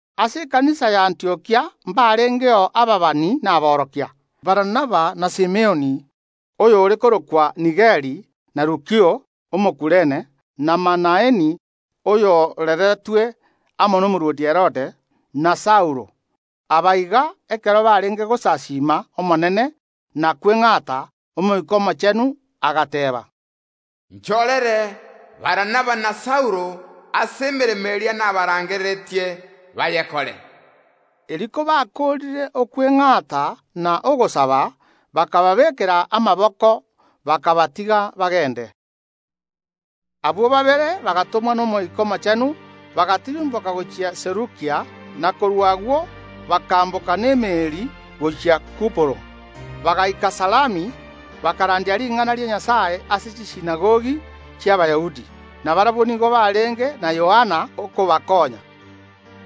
Ase ekanisa ya Abantiokia mbarengeo ababani amo aborokia: Barnaba na Simioni, oyo ore korokwa Nigeri, na Lukio Omokurene, na Manaeni oyo orereretwe amo nomorwoti Herode, na Saulo. Aba iga, ekero barenge gosasiima Omonene, na kweng’ata, Omoika Omochenu agateeba: “Nchorere Barnaba na Saulo ase emeremo eria nabarangereretie bayekore.” Erio kobakoorire okweng’ata na ogosaba bakababeekera amaboko, bakabatiga bagende. Abwo babere bagatomwa n’Omoika Omochenu, bagatirimboka gochia Selukia, na korwa agwo bakaamboka n’emeeri gochia Kuporo. Bagaika Salami, bakarandia ring’ana ria Nyasae ase chisinagogi chi’Abayahudi, na barabwo nigo barenge na Yohana okobakonya.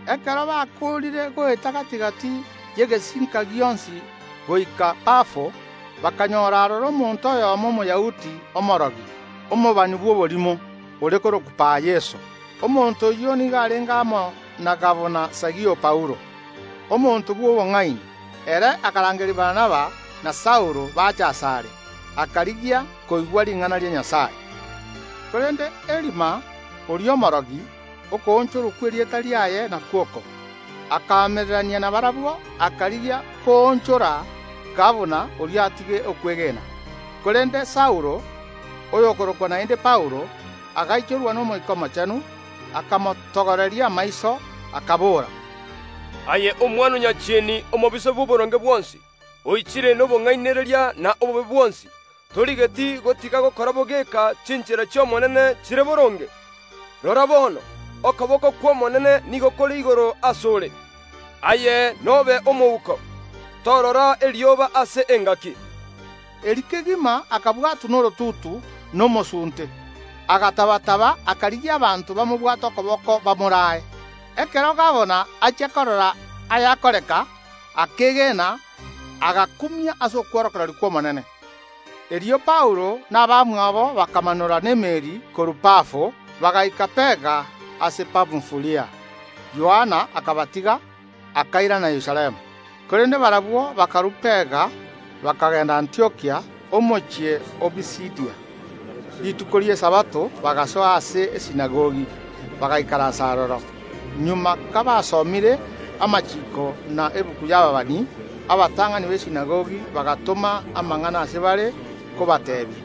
Ekero bakoorire goeta gati‐gati y’egesinka gionsi goika Pafo, bakanyora aroro omonto oyomo Omoyahudi omoriingoria, omobani bw’oborimo, ore korokwa Bar-Yeso. Omonto oyio nigo arenge amo na gabana Sergio Paulo, omonto bw’obong’aini. Ere akarangeria Barnaba na Saulo bache asare, akarigia koigwa ring’ana ria Nyasae. Korende Elima, oria omoringoria (okoonchorwa kw’erieta riaye nakwo oko) akaamererania nabarabwo, akarigia koonchora gabana oria atige okwegena. Korende Saulo, oyokorokwa naende Paulo, agaichorwa n’Omoika Omochenu, akamotogoreria amaiso, akabora, “Aye omwana o Saitani omobisa bw’oboronge bwonsi, oichire nobong’ainereria n’obobe bwonsi, torigeti gotiga gokora bogeka chinchera chia Nyasae Omobui chire boronge? Rora bono, okoboko kw’Omonene nigo kore igoro ase ore, aye nobe omouko, torora erioba ase engaki.” Erio kegima akabwatwa norotutu na omosunte, agataba‐taba akarigia abanto bamobwate okoboko bamoraae. Ekero gabana achia korora ayakoreka, akeegena, agakumia ase okworokereria kw’Omonene. Erio Paulo na abamwabo bakamanora n’emeeri korwa Pafo, bagaika Perga ase Pamfulia. Yohana akabatiga, akairana Yerusalemu, korende barabwo bakarua Perga, bakagenda Antiokia, omochie o Pisidia. Rituko ria Esabato bagasoa ase esinagogi, bagaikaransa aroro. Magega kabasomire amachiiko na egetabu y’ababani, abatang’ani b’esinagogi bagatoma amang’ana ase bare kobateebia: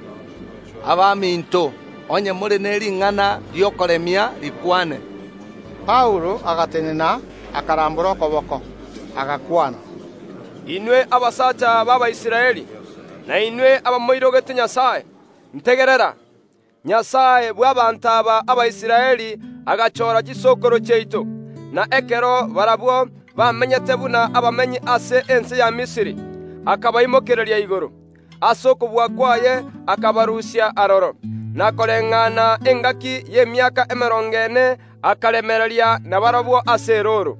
“Abaminto, onye more ne ring’ana ri’okoremia, rikwane!” Paulo agatenena, akarambora okoboko, agakwana: Inwe abasacha b’Abaisraeli, na inwe abamoirogete Nyasae, ntegerera. Nyasae bw’abaanto aba Abaisraeli agachora chisokoro chiaito, na ekero barabwo bamenyete buna abamenyi ase ense ya Misiri, akabaimokereria igoro. Ase okobua kwaye akabarusia aroro, na koreng’ana engaki y’emiaka emerongo ene akaremereria nabarabwo ase erooro.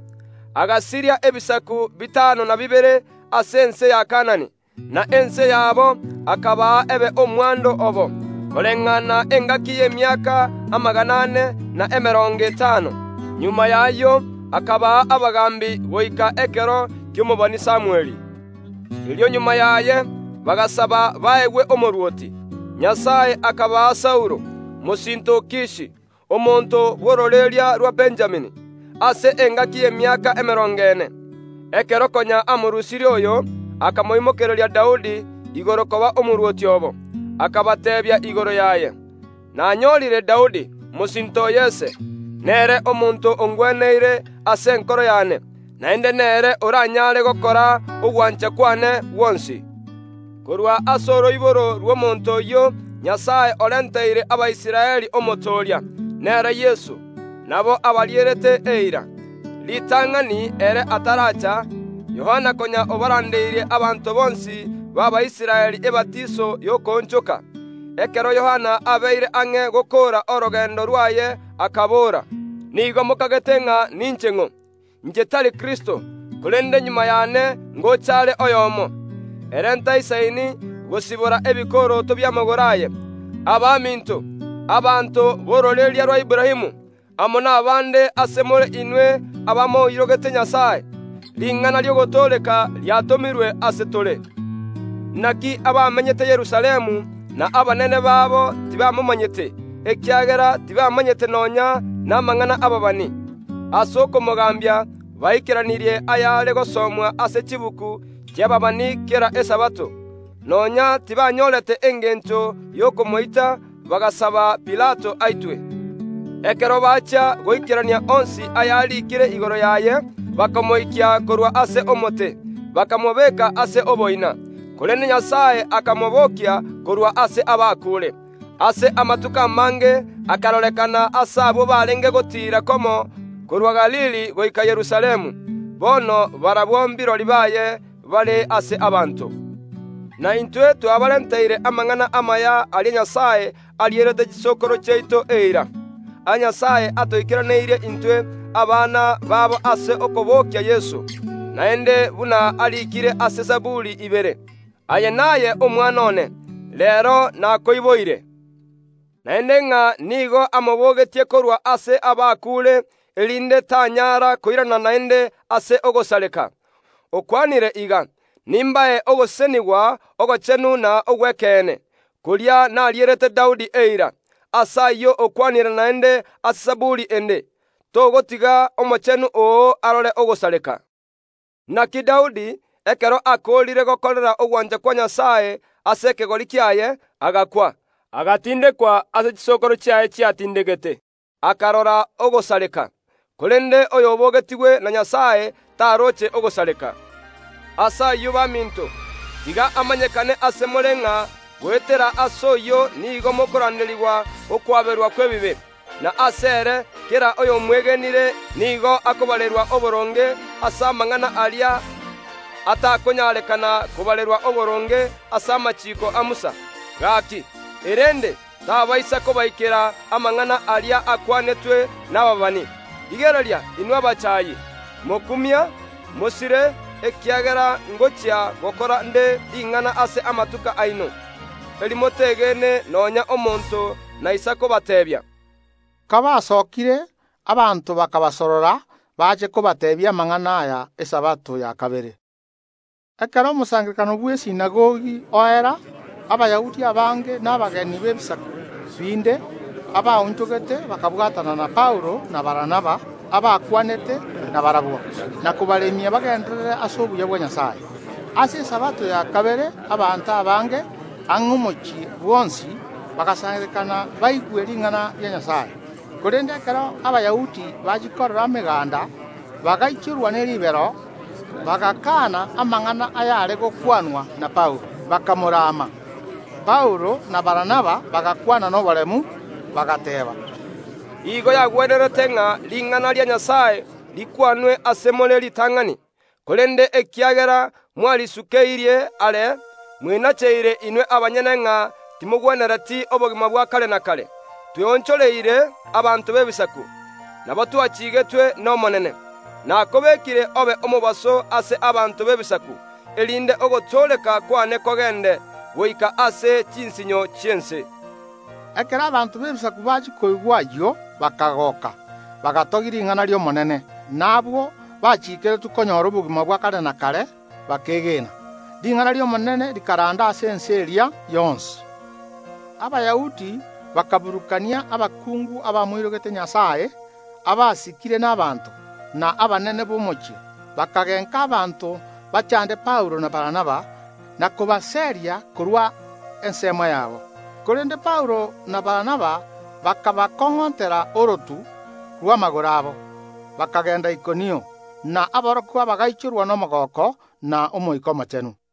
Agasiria ebisaku bitano na bibere ase ense ya Kaanani, na ense yabo akabaa ebe omwando obo, koreng’ana engaki y’emiaka amagana ane, na emerongo etano. Magega y’ayio akabaa abagaambi goika ekero ki’omobani Samweli. Erio magega yaye bagasaba baegwe omorwoti. Nyasae akabaa Saulo, mosinto o Kishi, omonto bw’ororeria rwa Benjamini, oyio obagamberete engaki y’emiaka emerongo ene. Ekero konya amorusirie oyo, akaimokereria Daudi igoro koba omorwoti obo. Akabateebia igoro yaye: Nanyorire Daudi, mosinto o Yese; nere omonto ongweneire ase enkoro yane, naende nere oraanyare gokora ogwancha kwane gwonsi. Korwa ase oroiboro rw’omonto oyio Nyasae orenteire Abaisraeli Omotooria, nere Yeso. Nabo abarierete eira. Ritang’ani ere ataraacha, Yohana konya obarandeirie abanto bonsi ba Israeli ebatiso y’okoonchoka. Ekero Yohana abeire ang’e gokoora orogendo rwaye akabora, Nigo mokagete ng’a ninche ng’o? Inche tari Kristo. Korende magega yane ngocha are oyomo, ere oyo inche ntaisaini gosibora chinuga ch’ebikoroto bi’amagoro aye. Abaminto, abanto b’ororeria rwa Aburaamu, amo nabande ase more inwe abamoirogete Nyasae, ring’ana ri’ogotooreka riatomirwe ase tore. Naki abamenyete Yerusalemu, na abanene babo tibamomanyete, ekiagera tibamanyete nonya namang’ana y’ababani. Ase okomogambia baikeranirie ayare gosomwa ase chibuku chi’ababani kera Esabato. Nonya tibanyorete engencho y’okomoita, bagasaba Pilato aitwe. Ekero bachia goikerania onsi ayariikire igoro yaye, bakamoikia korwa ase omote, bakamobeka ase oboina. Korende Nyasae akamobokia korwa ase abakuure. Ase amatuko amange akarorekana ase abwo barenge gotiira komo korwa Galili goika Yerusalemu. Bono barabwo kirori baye bare ase abanto. Na intwe twabarenteire amang’ana amaya aria Nyasae arierete chisokoro chiaito eira. Aya Nyasae atoikeraneirie intwe abana babo ase okobokia Yeso. Naende buna ariikire ase Zaburi ibere: Aye naye Omwana one, reero nakoiboire. Naende ng’a nigo amobogetie korwa ase abakuure, erinde tanyara koirana naende ase ogosareka, okwanire iga, Nimbae ogosesenigwa ogochenu na ogw’ekeene, koria narierete Daudi eira. Ase ayio okwanire naende ase Zaburi ende, Togotiga Omochenu oo arore ogosareka. Naki Daudi, ekero akoorire gokorera ogwancha kwa Nyasae ase ekegori kiaye, agakwa, agatindekwa ase chisokoro chiaye chiatindegetwe, akarora ogosareka. Korende oyo obogetigwe na Nyasae taroche ogosareka. Ase ayio baminto, tiga amanyekane ase more ng’a goetera ase oyio nigo mokoranderigwa okwaberwa kw’ebibe, na asere kera oyomwegenire nigo akobarerwa oboronge ase amang’ana aria atakonyarekana kobarerwa oboronge ase amachiiko a Musa. Gaki, erende, tabaisa kobaikera amang’ana aria akwanetwe nababani: Rigereria, inwe abachaayi, mokumie na mosire, ekiagera ngochia gokora ’nde ring’ana ase amatuko aino, eri motegene nonya ’monto onde bwensi naisa kobateebia. Kabasokire, abanto bakabasorora bache kobateebia amang’ana aya Esabato ya kabere. Ekero omosangererekano bw’esinagogi oera, Abayahudi abange na abegeni b’ebisaku binde abaonchogete bakabwatana na Paulo na Barnaba, abakwanete nabarabwo, na kobaremia bagenderere ase obuya bwa Nyasae. Ase Esabato ya kabere abanto abange, ang’e omochie bwonsi, bagasangererekana baigwe ring’ana ria Nyasae. Korende ekero Abayahudi bachia korora emeganda, bagaichorwa ne ribero, bagakaana amang’ana ayare gokwanwa na Paulo, bakamorama. Paulo na Barnaba bagakwana noboremu, bagateeba: Igo yagwenerete ng’a ring’ana ria Nyasae rikwanwe ase more ritang’ani. Korende ekiagera mwarisukeirie are mwenacheire inwe abanyene ng’a timogwenereti obogima bwa kare na kare, tweonchoreire abanto b’Ebisaku. Nabo twachigetwe n’Omonene, Nakobekire obe omobaso ase abanto b’Ebisaku, erinde ogotooreka kwane kogende, goike ase chinsinyo chi’ense. Ekero abanto b’Ebisaku bachia koigwa ayio bakagoka, bagatogia ring’ana ri’Omonene, na abwo bachiikeretwe konyora obogima bwa kare na kare bakeegena. Ring’ana ri’Omonene rikaranda ase ense eria yonsi. Abayahudi bakaburukania abakungu abamoirogete Nyasae, abasikire n’abanto, na abanene b’omochie, bakagenka abanto bachande Paulo na Barnaba, na kobaseria korwa ensemo yabo. Korende Paulo na Barnaba bakabakong’ontera orotu rw’amagoro abo, bakagenda Ikonio. Na aborokigwa bagaichorwa nomogooko na Omoika Omochenu.